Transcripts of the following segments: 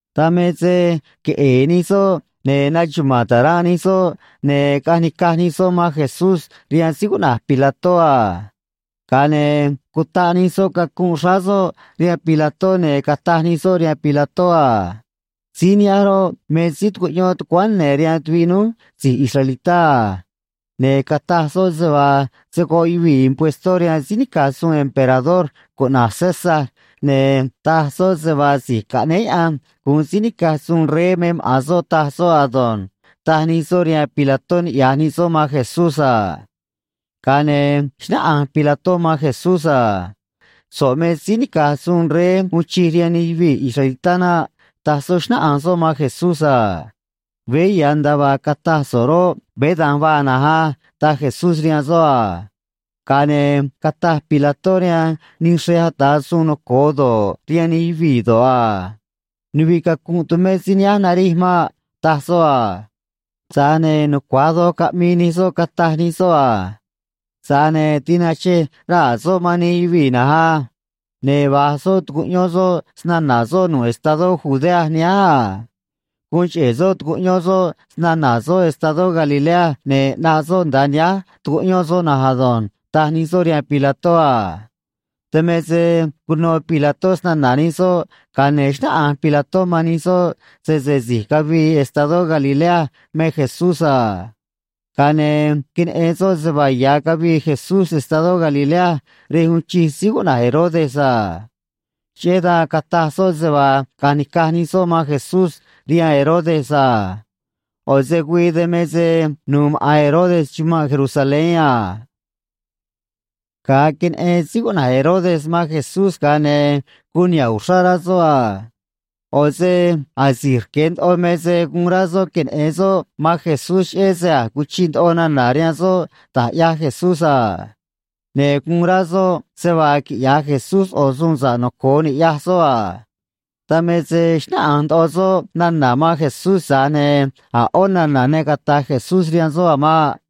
Dan me se queꞌe̱e̱ nij soꞌ, ne̱ naxuma̱a̱n taranꞌ nij soꞌ, ne̱ caꞌanj nica̱j nij soꞌ man Jesucristó rihaan síí cuꞌna̱j Pilato a. Ga̱a ne̱ cutaꞌ nij soꞌ cacunꞌ xráá soꞌ rihaan síí cuꞌna̱j Pilato, ne̱ cataj nij soꞌ rihaan síí cuꞌna̱j Pilato a: ―Síí nihánj roꞌ, me síí tucuꞌyón tucuáán ne̱ rihaan tuviꞌ núj si̱j israelitá, ne̱ cataj soꞌ se vaa se̱ goꞌ yuvii̱ puextó rihaan síí nica̱j suun cuꞌna̱j César, ne̱ taj soꞌ se vaa si̱j caꞌnéé Diose̱ gu̱un síí nica̱j suun rey me maꞌa̱n soꞌ, taj soꞌ ado̱nj ―taj nij soꞌ rihaan síí cuꞌna̱j Pilato, niꞌya̱j nij soꞌ man Jesucristó a. Ga̱a ne̱ xnáꞌanj síí cuꞌna̱j Pilato man Jesucristó a: ―So̱ꞌ me síí nica̱j suun rey uun chij rihaan nij yuvii̱ israelitá naꞌ ―taj soꞌ, xnáꞌanj soꞌ man Jesucristó a. ―Vej á ―taj Jesucristó rihaan soꞌ a. Ga̱a ne̱ cataj síí cuꞌna̱j Pilato rihaan nij xrej ata̱ suun noco̱o doj do̱ꞌ, rihaan nij yuvii̱ do̱ꞌ a: ―Nuviꞌ cacunꞌ tumé síí nihánj narij maꞌ ―taj soꞌ a: Tza̱j ne̱ nucua̱j doj caꞌmii nij soꞌ, cataj nij soꞌ: ―Tza̱j ne̱ queꞌe̱e̱ yuvii̱ uno se‑na̱na̱ soꞌ, ne̱ vaa güii quiꞌya̱j nij soꞌ sayuun na̱nj á. Ne̱ va̱j soꞌ tucuꞌyón soꞌ se‑na̱na̱ soꞌ nu̱ꞌ estadó Judea nihánj, ne̱ guun cheꞌe̱ soꞌ tucuꞌyón soꞌ se‑na̱na̱ soꞌ estadó Galilea, ne̱ ꞌnaꞌ soꞌ nda̱a nihánj tucuꞌyón soꞌ na̱nj ado̱nj ―taj nij soꞌ rihaan Pilato a. Dan me se cuno Pilato se‑na̱na̱ nij soꞌ, ga̱a ne̱ xnáꞌanj Pilato man nij soꞌ sese si̱j cavii estadó Galilea me Jesucristó a. Ga̱a ne̱ queneꞌen soꞌ se vaa ya̱ cavii Jesucristó estadó Galilea rej uun chij síí cuꞌna̱j Herodes a. Cheꞌé dan cataj soꞌ se vaa caꞌa̱nj ni̱caj nij soꞌ man Jesucristó rihaan síí cuꞌna̱j Herodes yoꞌ a. ꞌO̱ se güii dan me se nuû maꞌa̱n síí cuꞌna̱j Herodes chumanꞌ Jerusalén a. Ga̱a queneꞌen síí cuꞌna̱j Herodes man Jesucristó, ga̱a ne̱ guun niha̱ꞌ uxrá rá soꞌ a. ꞌO̱ se asi̱j rque̱ ndoꞌo me se guun rá soꞌ queneꞌe̱n soꞌ man Jesucristó, cheꞌé se a̱j cuchiꞌ nana̱ rihaan soꞌ da̱j ꞌyaj Jesucristó a. Ne̱ guun rá soꞌ se vaa quiꞌya̱j Jesucristó ꞌo̱ suun sa̱ꞌ noco̱o ni̱ꞌyaj soꞌ a. Dan me se xnáꞌanj ndoꞌo soꞌ nana̱ man Jesucristó, tza̱j ne̱ a̱ ꞌó nana̱ ne caꞌmi̱i̱ Jesucristó rihaan soꞌ a̱ maꞌ.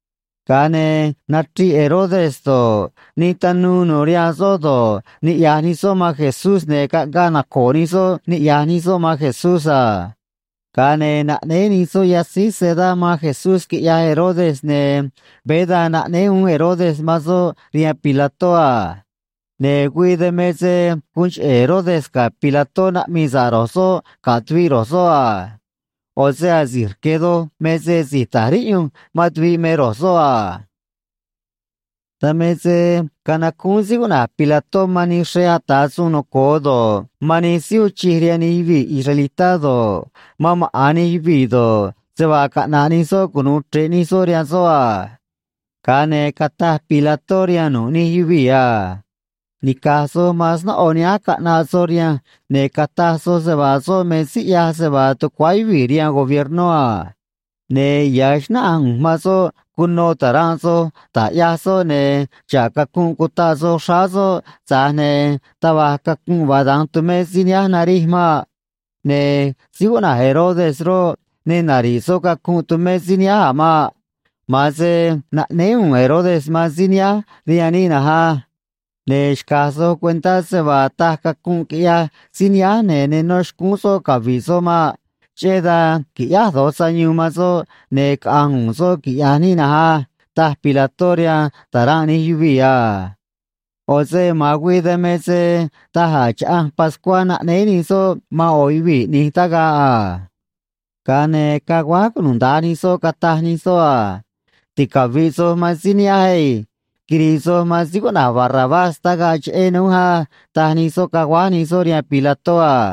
Ga̱a ne̱ nachriꞌ Herodes do̱ꞌ, nij tanuu nu̱u̱ rihaan soꞌ do̱ꞌ, niꞌya̱j nij soꞌ man Jesucristó, ne̱ caꞌngaꞌ naco̱o̱ nij soꞌ niꞌya̱j nij soꞌ man Jesucristó a. Ga̱a ne̱ naꞌnéé nij soꞌ yatzíj sedá man Jesucristó quiꞌyaj Herodes, ne̱ veé dan naꞌnéé uún Herodes man soꞌ rihaan Pilato a. Ne̱ güii dan me se guun cheꞌe̱ Herodes ga̱ Pilato naꞌmii sa̱ꞌ ro̱j soꞌ ga̱ tuviꞌ ro̱j soꞌ a. ꞌO̱ se asi̱j rque̱ doj me se si̱j ta̱j riꞌyunj man tuviꞌ me ro̱j soꞌ a. Dan me se canacúún síí cuꞌna̱j Pilato man nij xrej ata̱ suun noco̱o doj do̱ꞌ, man nij síí uun chij rihaan nij yuvii̱ israelitá do̱ꞌ, man maꞌa̱n nij yuvii̱ do̱ꞌ, se vaa caꞌna̱ꞌ nij soꞌ cunu̱u chre̱ꞌ nij soꞌ rihaan soꞌ a. Ga̱a ne̱ cataj Pilato rihaan nu̱ꞌ nij yuvii̱ a: ―Dan me se nica̱j soj man snóꞌo nihánj caꞌnaꞌ soj rihanj, ne̱ cataj soj se vaa soꞌ me síí me rá quiꞌya̱j nij yuvii̱ sayuun a. Ne̱ veé xnáꞌanj ꞌu̱nj man soꞌ cuno taranꞌ soj da̱j ꞌyaj soꞌ, ne̱ xa̱ꞌ cacunꞌ cutaꞌ soj xráá soꞌ, tza̱j ne̱ taj va̱j cacunꞌ vaa da̱nj tumé síí nihánj narij maꞌ. Ne̱ síí cuꞌna̱j Herodes roꞌ, ne nari̱ꞌ soꞌ cacunꞌ tumé síí nihánj a̱ maꞌ. Ma̱a̱n se naꞌnéé u̱u̱n síí cuꞌna̱j Herodes man síí nihánj rihaan níꞌ na̱nj á. Ne̱ xca̱j soj cuentá se vaa taj cacunꞌ quiꞌyaj síí nihánj, ne̱ ne nó xcúún soꞌ cavi̱ꞌ soꞌ maꞌ. Cheꞌé dan qui̱ꞌyáj do̱j sayuun man soꞌ, ne̱ caꞌa̱nj u̱u̱n soꞌ, quiꞌya̱j níꞌ na̱nj á ―taj Pilato rihaan taranꞌ nij yuvii̱ a. ꞌO̱ se ma̱a̱n güii dan me se daj a̱ chaꞌanj pascuá naꞌnéé nij soꞌ man ꞌo̱ yuvii̱ ꞌni̱j tagaꞌ a. Ga̱a ne̱ caguáj cunuda̱nj nij soꞌ, cataj nij soꞌ a: ―Ticavi̱ꞌ soj man síí nihánj ei. Ticavi̱ꞌ soj man síí nihánj ei. Ne̱ quiri̱i̱ so̱ꞌ man síí cuꞌna̱j Barrabás tagaꞌ cheꞌé núj á ―taj nij soꞌ, caguáj nij soꞌ rihaan Pilato a.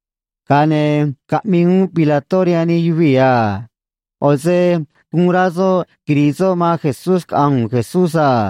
Ga̱a ne̱ caꞌmii uún Pilato rihaan nij yuvii̱ a. ꞌO̱ se guun rá soꞌ quiri̱i̱ soꞌ man Jesucristó caꞌa̱nj Jesucristó a.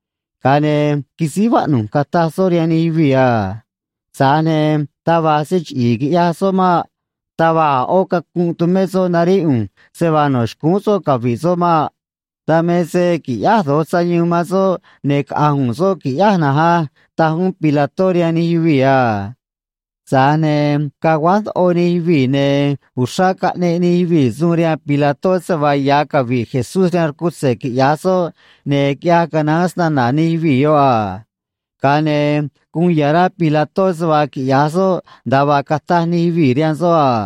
Ga̱a ne̱ quisíj vaꞌnu̱j cataj soꞌ rihaan nij yuvii̱: ―Tza̱j ne̱ taj va̱j se chiꞌi̱i̱ quiꞌyaj soꞌ maꞌ. Taj va̱j cacunꞌ tumé soꞌ, ne̱ ne nó xcúún soꞌ cavi̱ꞌ soꞌ maꞌ. Dan me se qui̱ꞌyáj do̱j sayuun man soꞌ, ne̱ caꞌa̱nj u̱u̱n soꞌ qui̱ꞌyáj na̱nj á ―taj uún Pilato rihaan nij yuvii̱ a. Tza̱j ne̱ caguáj ndoꞌo nij yuvii̱, ne̱ uxrá caꞌneꞌ nij yuvii̱ suun rihaan Pilato se vaa ya̱ cavi̱ꞌ Jesucristó rihaan rcutze̱ quiꞌya̱j soꞌ, ne̱ guun nucua̱j doj se‑na̱na̱ nij yuvii̱ yoꞌ a. Ga̱a ne̱ guun ya̱ rá Pilato se vaa quiꞌya̱j soꞌ nda̱a vaa cataj nij yuvii̱ rihaan soꞌ a.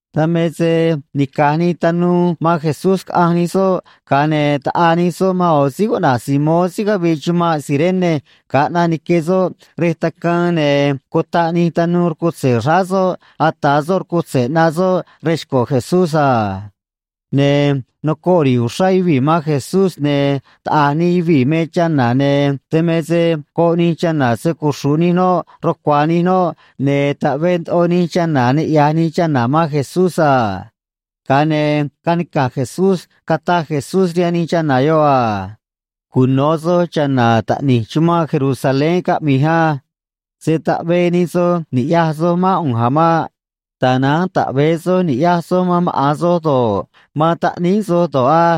Dan me se nica̱j nii man Jesucristó caꞌanj nii, ga̱a ne̱ quitaꞌaa nii man yoꞌo̱ síí cuꞌna̱j Simón síí cavii chumanꞌ Cirene ga̱a ꞌnaꞌ nique soꞌ rej tacaan, ne̱ cutaꞌ nii rcutze̱ xráá soꞌ ata̱ soꞌ rcutze̱ ꞌnaꞌ soꞌ rej xco̱ Jesucristó a. Ne̱ nocoꞌ queꞌe̱e̱ yuvii̱ man Jesucristó, ne̱ taꞌa̱j nij yuvii̱ me chana̱, ne̱ dan me se goꞌ nij chana̱ se‑cuxru̱ꞌ nij noꞌ rucua̱a̱ nij noꞌ, ne̱ taꞌvee ndoꞌo nij chana̱ niꞌya̱j nij chana̱ man Jesucristó a. Ga̱a ne̱ canica̱j Jesucristó, cataj Jesucristó rihaan nij chana̱ yoꞌ: ―Cuno̱ soj cha̱na̱ taꞌni̱j chumanꞌ Jerusalén caꞌmi̱j á. Se̱ taꞌvee nij soj ni̱ꞌyaj soj mán ꞌu̱nj a̱ maꞌ. Tza̱j ne̱ taꞌve̱e soj ni̱ꞌyaj soj man maꞌa̱n soj do̱ꞌ, man maꞌa̱n taꞌníí soj do̱ꞌ á.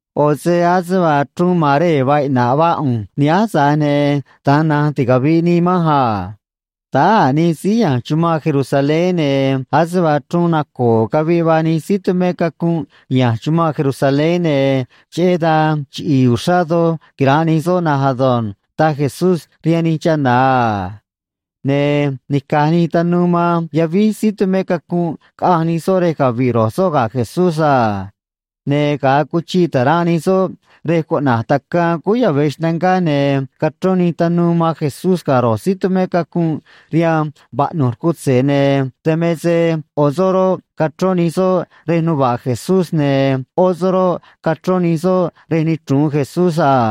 ꞌO̱ se ase vaa chruun maree̱ vaa iꞌna̱ꞌ vaa ꞌu̱nj nihánj, tza̱j ne̱ da̱nj na̱nj ticavi̱ꞌ nii manj a. Táá a̱ nij síí ne̱ chumanꞌ Jerusalén, ne̱ ase vaa chruun naco̱o̱ caviꞌ vaa nij síí tumé cacunꞌ ne̱ chumanꞌ Jerusalén, ne̱ cheꞌé dan chiꞌi̱i̱ uxrá doj quira̱nꞌ nij soꞌ na̱nj ado̱nj ―taj Jesucristó rihaan nij chana̱ a. Ne̱ nica̱j nii man yavíj ro̱j síí tumé cacunꞌ, caꞌanj nii rej cavi̱ꞌ ro̱j soꞌ ga̱ Jesucristó a. Ne̱ ga̱a cuchiꞌ taranꞌ nij soꞌ rej cuꞌna̱j Tacaan Cúú Yave̱ Xnangá, ne̱ cachrón nii man Jesucristó ga̱ ro̱j síí tumé cacunꞌ rihaan vaꞌnu̱j rcutze̱, ne̱ dan me se yoꞌo̱ soꞌ roꞌ, cachrón nii rej nuva̱ꞌ Jesucristó, ne̱ yoꞌó soꞌ roꞌ, cachrón nii rej nichru̱un Jesucristó a.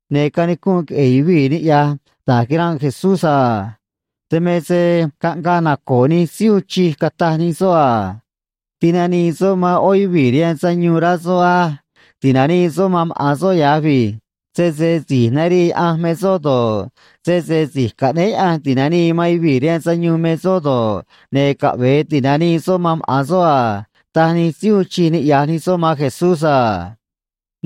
Ne̱ canicunꞌ queꞌe̱e̱ yuvii̱ niꞌya̱j da̱j quira̱nꞌ Jesucristó a. Dan me se caꞌngaꞌ naco̱o̱ nij síí uun chij, cataj nij soꞌ: ―A̱j tinanii soꞌ man yoꞌó yuvii̱ rihaan sayuun, rá soꞌ á. Caꞌve̱e ti̱nanii soꞌ man maꞌa̱n soꞌ ya̱j ei. Sese si̱j narii Diose̱ me soꞌ do̱ꞌ, sese si̱j caꞌnéé Diose̱ ti̱nanii man yuvii̱ rihaan sayuun me soꞌ do̱ꞌ, ne̱ caꞌve̱e ti̱nanii maꞌa̱n soꞌ man soꞌ a ―taj nij síí uun chij niꞌya̱j nij soꞌ man Jesucristó a.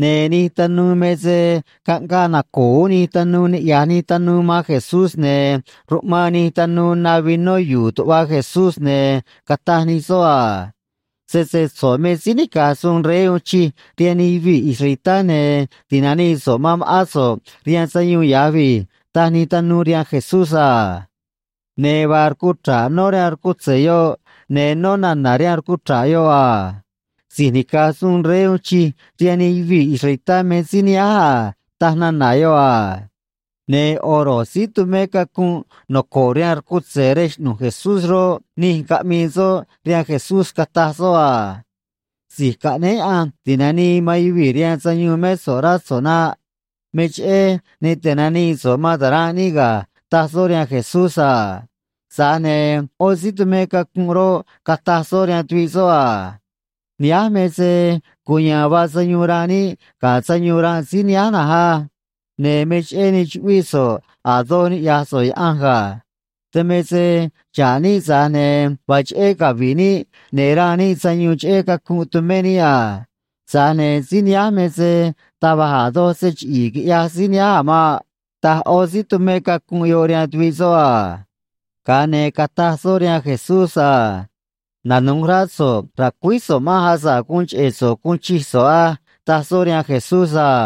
Ne̱ nij tanuu, tza̱j ne̱ caꞌngaꞌ naco̱o̱ uún nij tanuu niꞌya̱j nij tanuu man Jesucristó, ne̱ ruꞌmaan nij tanuu na vinó yu̱u̱ tuꞌva Jesucristó, ne̱ cataj nij soꞌ: ―Sese so̱ꞌ me síí nica̱j suun rey uun chij rihaan nij yuvii̱ israelitá, ne̱ ti̱nanii so̱ꞌ man ma̱ꞌán so̱ꞌ rihaan sayuun ya̱j vij ―taj nij tanuu rihaan Jesucristó a. Ne̱ vaa rcuchra̱ꞌ nó rihaan rcutze̱ yoꞌ, ne̱ nó nana̱ rihaan rcuchra̱ꞌ yoꞌ se vaa: “Si̱j nica̱j suun rey uun chij rihaan nij yuvii̱ israelitá me síí nihánj a”, taj nana̱ yoꞌ a. Ne̱ yoꞌo̱ tuviꞌ ro̱j síí tumé cacunꞌ noco̱ꞌ rihaan rcutze̱ rej xꞌnu̱j Jesucristó roꞌ, nij caꞌmii soꞌ rihaan Jesucristó, cataj soꞌ: ―Si̱j caꞌnéé Diose̱ ti̱nanii man yuvii̱ rihaan sayuun mé so̱ꞌ, rá so̱ꞌ naꞌ. Me cheꞌé ne tinanii so̱ꞌ man taranꞌ níꞌ ga̱ ―taj soꞌ rihaan Jesucristó a. Tza̱j ne̱ yoꞌó síí tumé cacunꞌ roꞌ, cataj soꞌ rihaan tuviꞌ soꞌ: ―Nihánj me se cuya̱a̱n vaa sayuun ranꞌ níꞌ ga̱ sayuun ranꞌ síí nihánj na̱nj á. Ne̱ me cheꞌé ne chuꞌvíꞌ so̱ꞌ a̱ doj niꞌya̱j so̱ꞌ Diose̱ ga̱. Dan me se xa̱ꞌ níꞌ, tza̱j ne̱ vaa cheꞌé cavi̱ꞌ níꞌ, ne̱ ranꞌ níꞌ sayuun cheꞌé cacunꞌ tumé níꞌ, tza̱j ne̱ xa̱ꞌ síí nihánj, tza̱j ne̱ taj va̱j a̱ doj se chiꞌi̱i̱ ne quiꞌya̱j síí nihánj a̱ maꞌ ―taj yoꞌó síí tumé cacunꞌ yoꞌ rihaan tuviꞌ soꞌ a. Ga̱a ne̱ cataj soꞌ rihaan Jesucristó a: ―Se̱ quiniꞌyón so̱ꞌ ra̱cuíj so̱ꞌ manj, asa̱ꞌ guun cheꞌe̱ so̱ꞌ guun chij so̱ꞌ a̱ maꞌ ―taj soꞌ rihaan Jesucristó a.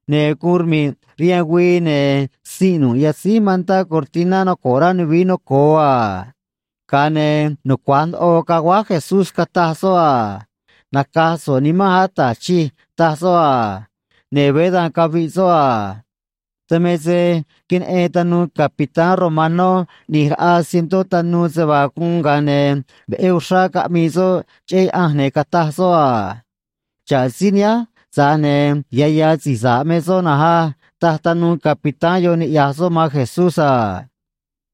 Ne̱ guun rmi̱ꞌ rihaan güii, ne̱ sinꞌ nu̱ꞌ yatzíj cortiná noco̱ꞌ rá nuvií noco̱o a. Ga̱a ne̱ nucua̱j ndoꞌo caguáj Jesucristó, cataj soꞌ: ―Naca̱j so̱ꞌ nimanj, Ata̱j Chij ―taj soꞌ, ne̱ veé dan caviꞌ soꞌ a. Dan me se queneꞌen tanuu capitán se vaa guun, ga̱a ne̱ veꞌé uxrá caꞌmii soꞌ cheꞌé Diose̱, ne̱ cataj soꞌ: ―Xa̱ꞌ síí nihánj, tza̱j ne̱ ya̱ ya̱ síí sa̱ꞌ me soꞌ na̱nj á ―taj tanuu yoꞌ niꞌya̱j soꞌ man Jesucristó a.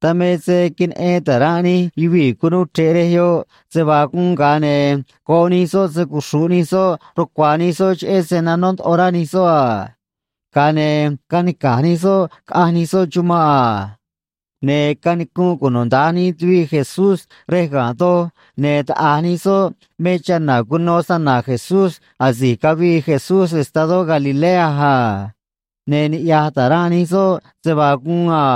Dan me se queneꞌen taranꞌ nij yuvii̱ cunuu chre̱ꞌ rej yoꞌ se vaa guun, ga̱a ne̱ goꞌ nij soꞌ se‑cuxru̱ꞌ nij soꞌ rucua̱a̱ nij soꞌ cheꞌé se nanó ndoꞌo rá nij soꞌ, ga̱a ne̱ canica̱j nij soꞌ caꞌanj nij soꞌ chumanꞌ a. Ne̱ canicunꞌ cunuda̱nj nij tuviꞌ Jesucristó rej ga̱nꞌ doj, ne̱ taꞌa̱j nij soꞌ me chana̱ cuno se‑na̱na̱ Jesucristó asi̱j cavii Jesucristó estadó Galilea a. Ne̱ niꞌya̱j taranꞌ nij soꞌ man Jesucristó a.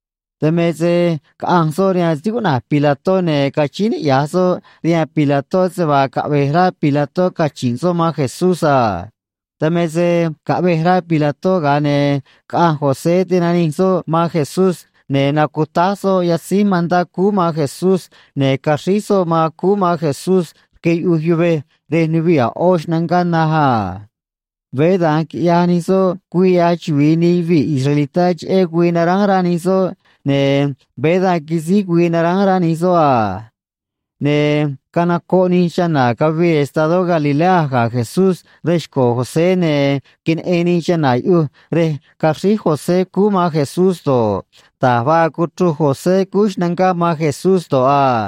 Dan me se caꞌanj soꞌ rihaan síí cuꞌna̱j Pilato, ne̱ cachíín niꞌya̱j soꞌ rihaan síí cuꞌna̱j Pilato se vaa caꞌve̱j rá síí cuꞌna̱j Pilato cachi̱nꞌ soꞌ man Jesucristó a. Dan me se caꞌvej síí cuꞌna̱j Pilato, ga̱a ne̱ caꞌanj síí cuꞌna̱j José, tinanij soꞌ man Jesucristó, ne̱ nacutáj soꞌ yatzíj mantá xráá Jesucristó, ne̱ caxríj soꞌ man Jesucristó rque yuꞌuj yuvej rej nuviꞌ a̱ ꞌó xnangá naj a. Veé da̱nj quiꞌyaj nij soꞌ güii ꞌyaj chuvi̱i nij yuvii̱ israelitá cheꞌé güii nara̱a̱n rá nij soꞌ, ne̱ veé da̱nj quisíj güii naránj rá nij soꞌ a. Ne̱ canocoꞌ nij chana̱ cavii estadó Galilea ga̱ Jesucristó rej xco̱ síí cuꞌna̱j José, ne̱ queneꞌen nij chana̱ yuꞌuj rej caxríj síí cuꞌna̱j José man Jesucristó,